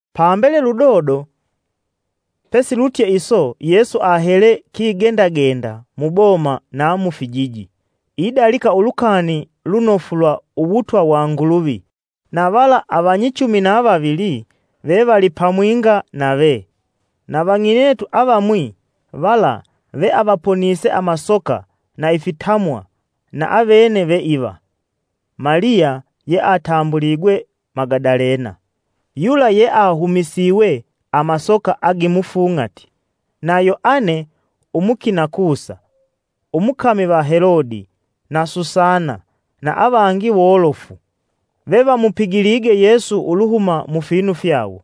Pambele ludodo pesilutye iso Yesu ahele kigendagenda muboma na mufijiji, idalika Ulukani Lunofu lwa Uwutwa wa Nguluvi. Na vala avanyichumi na vavili vevali pamwinga navee. Na vang'inetu avamwi vala veavaponise amasoka na ifitamwa na avene ve iva: Maliya (yeatambuligwe Magadalena), yula yeahumisiwe amasoka agimufung'ati, Na Yoane, umukina Kusa, umukami va Helodi na Susana na avangi wolofu, vevamupigilige Yesu uluhuma mufinu fyawo.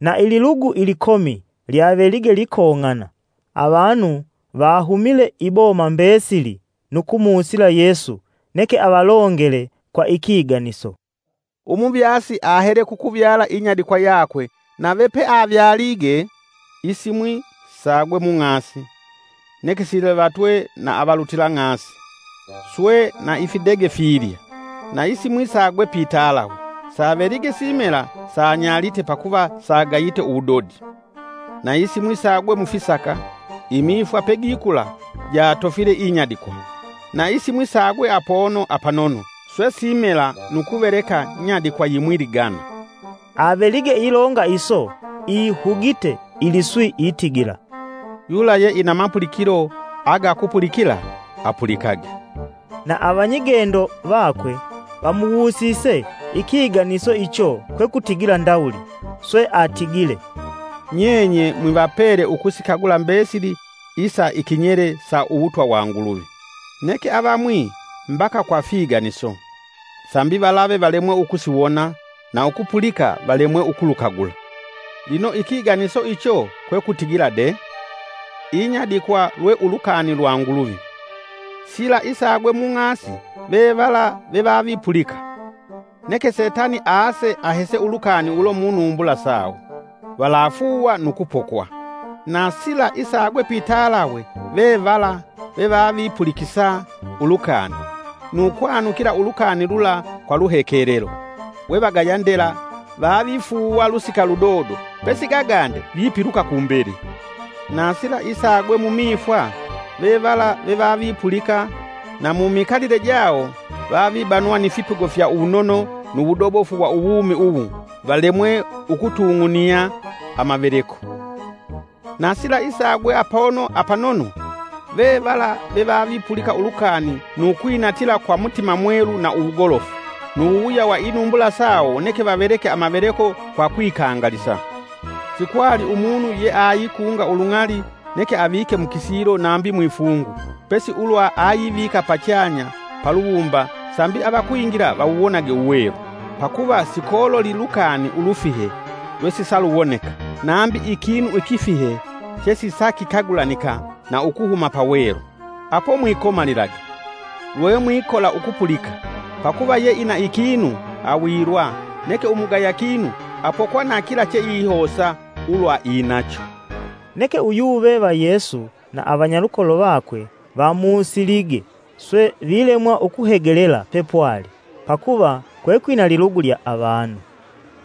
Na ililugu ilikomi lyavelige likong'ana, avanu vahumile iboma mbesili nu kumusila Yesu neke avalongele, kwa ikiganiso. “Umuvyasi ahele kukuvyala inyadikwa yakwe nave peavyalige, isimwi sagwe mung'asi, neke silivatwe na avalutila ng'asi swe na ifidege filya. Na isimwi sagwe pitalawe, savelige simela sanyalite pakuva sagayite uwudodi. Na isimwi sagwe mufisaka, imifwa pegikula jatofile inyadikwa. Na isimwi sagwe apono apanono, swe simela nu kuveleka nyadikwa yimwi ligana.” Avelige ilonga iso, ihugite iliswi itigila, “Yula yeina mapulikilo aga ukupulikila apulikage!” Na avanyigendo vakwe vamuwusise ikiganiso icho kwekutigila ndawuli. Swe atigile, “Nyenye mwivapele ukusikagula mbesili isa ikinyele sa uwutwa wa Nguluvi; neke avamwi mbaka kwa figaniso, sambi valave valemwe ukusiwona na ukupulika valemwe ukulukagula. “Lino ikiganiso icho kwe kutigila de: Inyadikwa lwe ulukani lwa Nguluvi. Sila isagwe mung'asi vevala vevavipulika; neke Setani aase ahese ulukani ulo munumbula sawo, valafuuwa nu kupokwa. Na sila isagwe pitalawe ve vala, vevavipulikisa ulukani, nu kwanukila ulukani lula kwa luhekelelo, we vagaya ndela vavifuuwa lusika ludodo pesigagande vipiluka kumbele. Na sila isagwe mumifwa, ve vala vevavipulika, na mumikalile jawo vavibanwa ni fipigo fya uwunono nu wudobofu wa uwumi uwu valemwe ukutung'unia amaveleko. Na sila isagwe apono apanono, vevala vevavipulika ulukani nu kwinatila kwa mutima mwelu na uwugolofu, nu wuwuya wa inumbula sawo neke vaveleke amaveleko kwa kwikangalisa. “Sikwali umunu yeaikunga ulung'ali neke avike mukisilo nambi mwifungu pesi ulwa ayivika pachanya, paluwumba sambi avakwingila vawuwonage uwelu.” “Pakuva sikololi lukani ulufike lwesisaluwoneka, nambi ikinu ikifihe chesisakikagulanika na ukuhuma pawelu.” “Apo mwikomalilage, lwemwikola ukupulika; pakuva yeina ikinu awilwa neke umugaya kinu apokwa na kila cheihosa ulwa inacho.” Neke uyuve va Yesu na avanyalukolo vakwe vamusilige swe vilemwa ukuhegelela pepwali pakuva kwekwina lilugu lya avanu.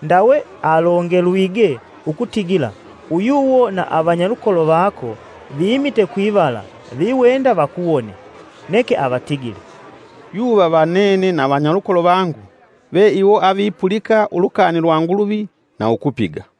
Ndawe alongelwige ukutigila, uyuwo na avanyalukolo vako vimite kwivala viwenda vakuwone. Neke avatigile, “Yuva va nene na avanyalukolo vangu ve iwo avipulika ulukani lwa Nguluvi na ukupiga.”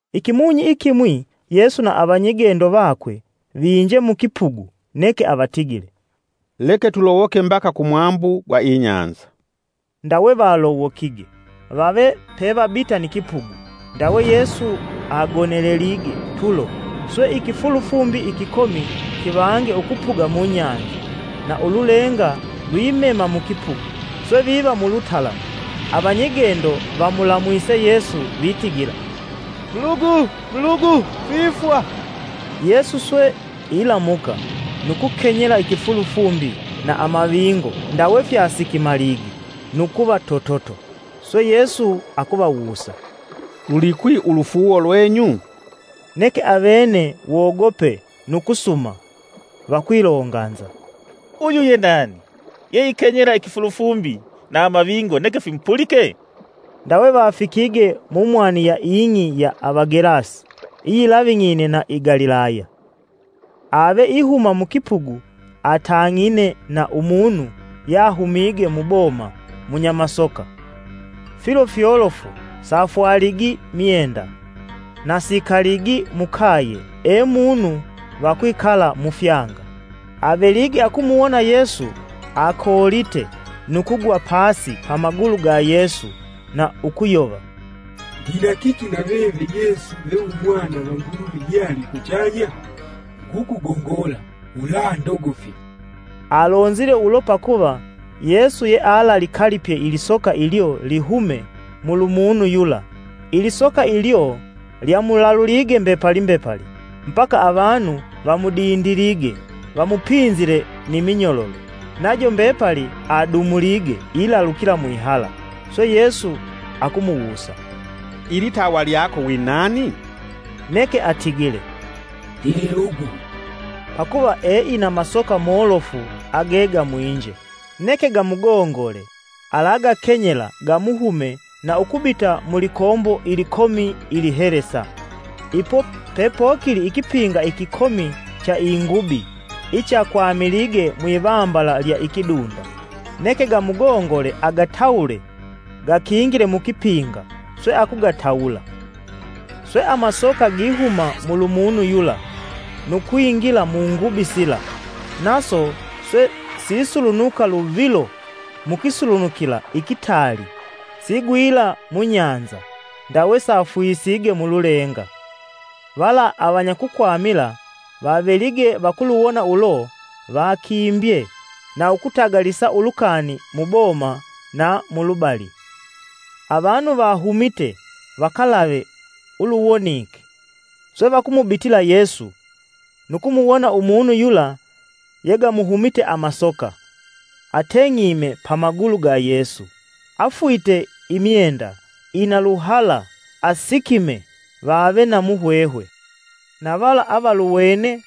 Ikimunyi ikimwi Yesu na avanyigendo vakwe vinje mukipugu, neke avatigile, “Leke tulowoke mbaka kumwambu gwa inyanza.” Ndawe valowokige. Vave pevabita ni kipugu ndawe Yesu agonelelige tulo. Swe ikifulufumbi ikikomi kivange ukupuga munyanza na ululenga lwimema mukipugu, swe viva mulutalamu. Avanyigendo vamulamwise Yesu vitigila, “Mulugu mulugu, twifwa!” Yesu swe ilamuka nu kukenyela ikifulufumbi na amavingo ndawe fyasikimalige nu kuva tototo. Swe Yesu akuvawusa, “Lulikwi ulufuuwo lwenyu?” Neke avene wogope nu kusuma, vakwilonganza, “Uyu ye nani, yeikenyela ikifulufumbi na amavingo neke fimupulike?” Ndawe vafikige mumwani ya ing'i ya Avagelasi iyilaving'ine na i Galilaya. Ave ihuma mukipugu atang'ine na umunu yahumige muboma munyamasoka, filo fyolofu safwaligi myenda, na sikaligi mukaye e munu vakwikala mufyanga. Avelige akumuwona Yesu, akoolite nu kugwa pasi pamagulu ga Yesu na ukuyova, “Ndina kiki naveve Yesu ve umwana va Nguluvi yali kuchanya? Ngukugongola, “Ulandogofya!” Alonzile ulo pakuva Yesu yealalikalipye ilisoka ilyo lihume mulumunu yula. Ilisoka ilyo lyamulalulige mbepali mbepali mbaka avanu vamudindilige vamupinzile ni minyololo, najo mbepali adumulige ilalukila mwihala. Swe Yesu akumuwusa, “Ilitawa lyako winani?” neke atigile, “Ndi lilugu” —pakuva eina masoka molofu agegamwinje. Neke gamugongole alagakenyela gamuhume na ukubita mulikombo ilikomi ilihelesa. Ipo pepokili ikipinga ikikomi cha ingubi ichakwamilige mwivambala lya ikidunda; neke gamugongole agatawule gakingile mukipinga. Swe akugatawula. Swe amasoka gihuma mulumunu yula nu kwingila mungubi sila; naso swe sisulunuka luvilo mukisulunukila ikitaali sigwila munyanza ndawe safwisige mululenga. Vala avanyakukwamila vavelige vakuluwona ulo, vakimbye na ukutagalisa ulukani mu boma na mulubali. Avanu vahumite vakalave uluwonike, swe vakumubitila Yesu, nu kumuwona umunu yula yegamuhumite amasoka, ateng'ime pamagulu ga Yesu, afwite imyenda ina luhala asikimee, vave na muhwehwe. Na vala avaluwene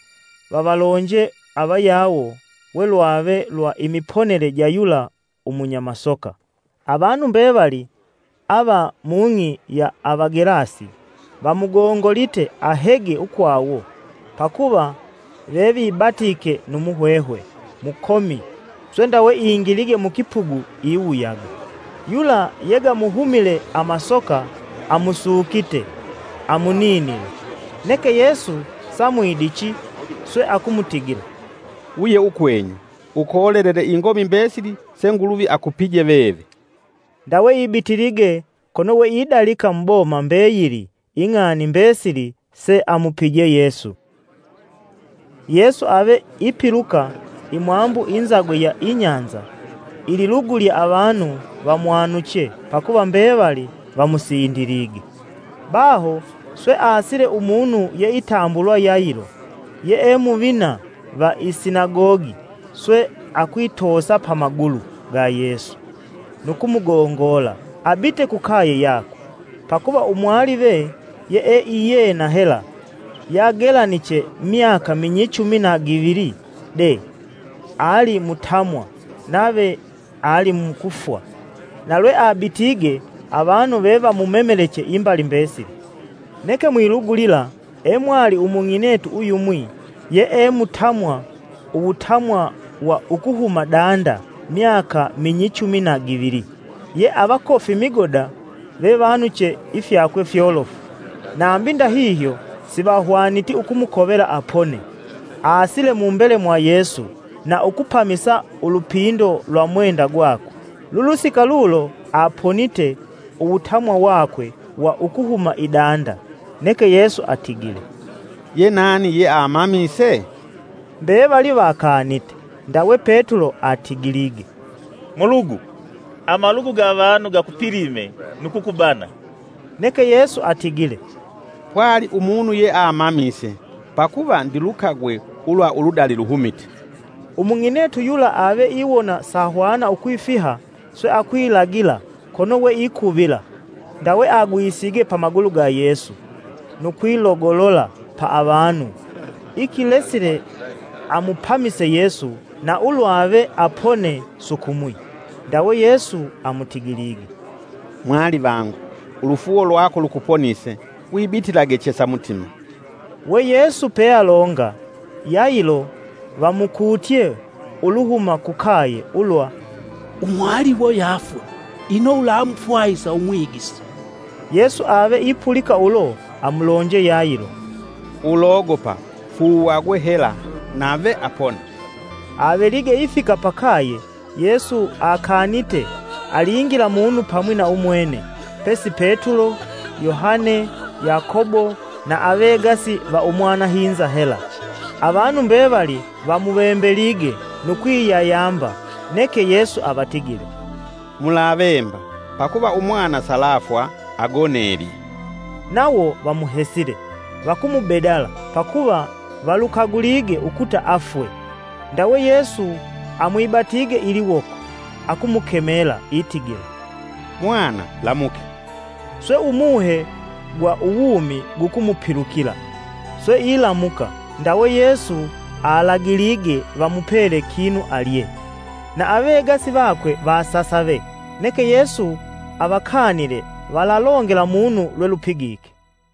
vavalonje avayawo we lwave lwa imiponele ja yula umunya masoka. Avanu mbevali ava mung'i ya Avagelasi vamugongolite ahege ukwawo pakuva vevibatike nu muhwehwe mukomi, swe ndawe ingilige mukipugu iwuyaga. Yula yegamuhumile amasoka amusukite amuninile. Neke Yesu samwidichi swe akumutigila, “Wuye ukwenyu, ukolelele ingomi mbesili se Nguluvi akupije veve.” Ndawe ibitilige kono we idalika muboma mbeyili ing'ani mbesili seamupije Yesu. Yesu ave ipiluka imwambu inzagwe ya inyanza ililugu lya avanu vamwanuche pakuva mbevali vamusindilige. Baho swe aasile umunu yeitambulwa Yailo, yee muvina va i sinagogi swe akwitoosa pa magulu ga Yesu nu kumugongola abite kukaye yakwe, pakuva umwalive yee iyena hela, yagelaniche myaka minyichumi na givili dee ali mutamwa nave alimukufwa. Na lweabitige avanu vevamumemeleche imbali mbesili. Neke mwilugu lila e mwali umung'inetu uyumwi yee mutamwa uwutamwa wa ukuhuma danda myaka minyichumi na givili, ye avakofi migoda vevanuche ifyakwe fyolofu, nambi ndahihyo sivahwaniti ukumukovela apone. Aasile mumbele mwa Yesu na ukupamisa ulupindo lwa umwenda gwakwe, lulusika lulo aponite uwutamwa wakwe wa ukuhuma idanda. Neke Yesu atigile, “Ye nani yemamise?” Mbevali vakanite, Ndawe Petulo atigilige, “Mulugu, amalugu ga avanu gakupilime nu kukubana!” Neke Yesu atigile, “Pwali umunu yeamamise, pakuva ndilukagwe ulwa uludali luhumite.” Umung'inetu yula ave iwona sahwana ukwifiha swe akwilagila kono we ikuvila, ndawe agwisige pamalugu ga Yesu nu kwilogolola pa avanu ikilesile amupamise Yesu na ulwave apone sukumwi. Ndawe Yesu amutigilige, “Mwalivangu, ulufuuwo lwako lukuponise. Wibitilage chesa mutima.” We Yesu pealonga, Yailo vamukutye uluhuma kukaye ulwa, “Umwaliwo yafwe, ino ulamufwahisa Umwigisi?” Yesu ave ipulika ulo amulonje Yailo, “Ulogopa fuuwagwe hela nave apona.” Avelige ifika pakaye Yesu akanite alingila munu pamwi na umwene, pesi Petulo, Yohane, Yakobo, na avegasi va umwanahinza hela. Avanu mbevali vamuvembelige nu kwiyayamba, neke Yesu avatigile, “Mulavemba, pakuva umwana salafwa agonelye!” Nawo vamuhesile, vakumubedala pakuva valukagulige ukuta afwe. Ndawe Yesu amwibatige iliwoko, akumukemela itigila, “Mwana lamuke!” Swe umuhe gwa uwumi gukumupilukila, swe ilamuka ndawe Yesu alagilige vamupele kinu alye. Na avegasi vakwe vasasave, neke Yesu avakanile valalongela munu lwelupigike.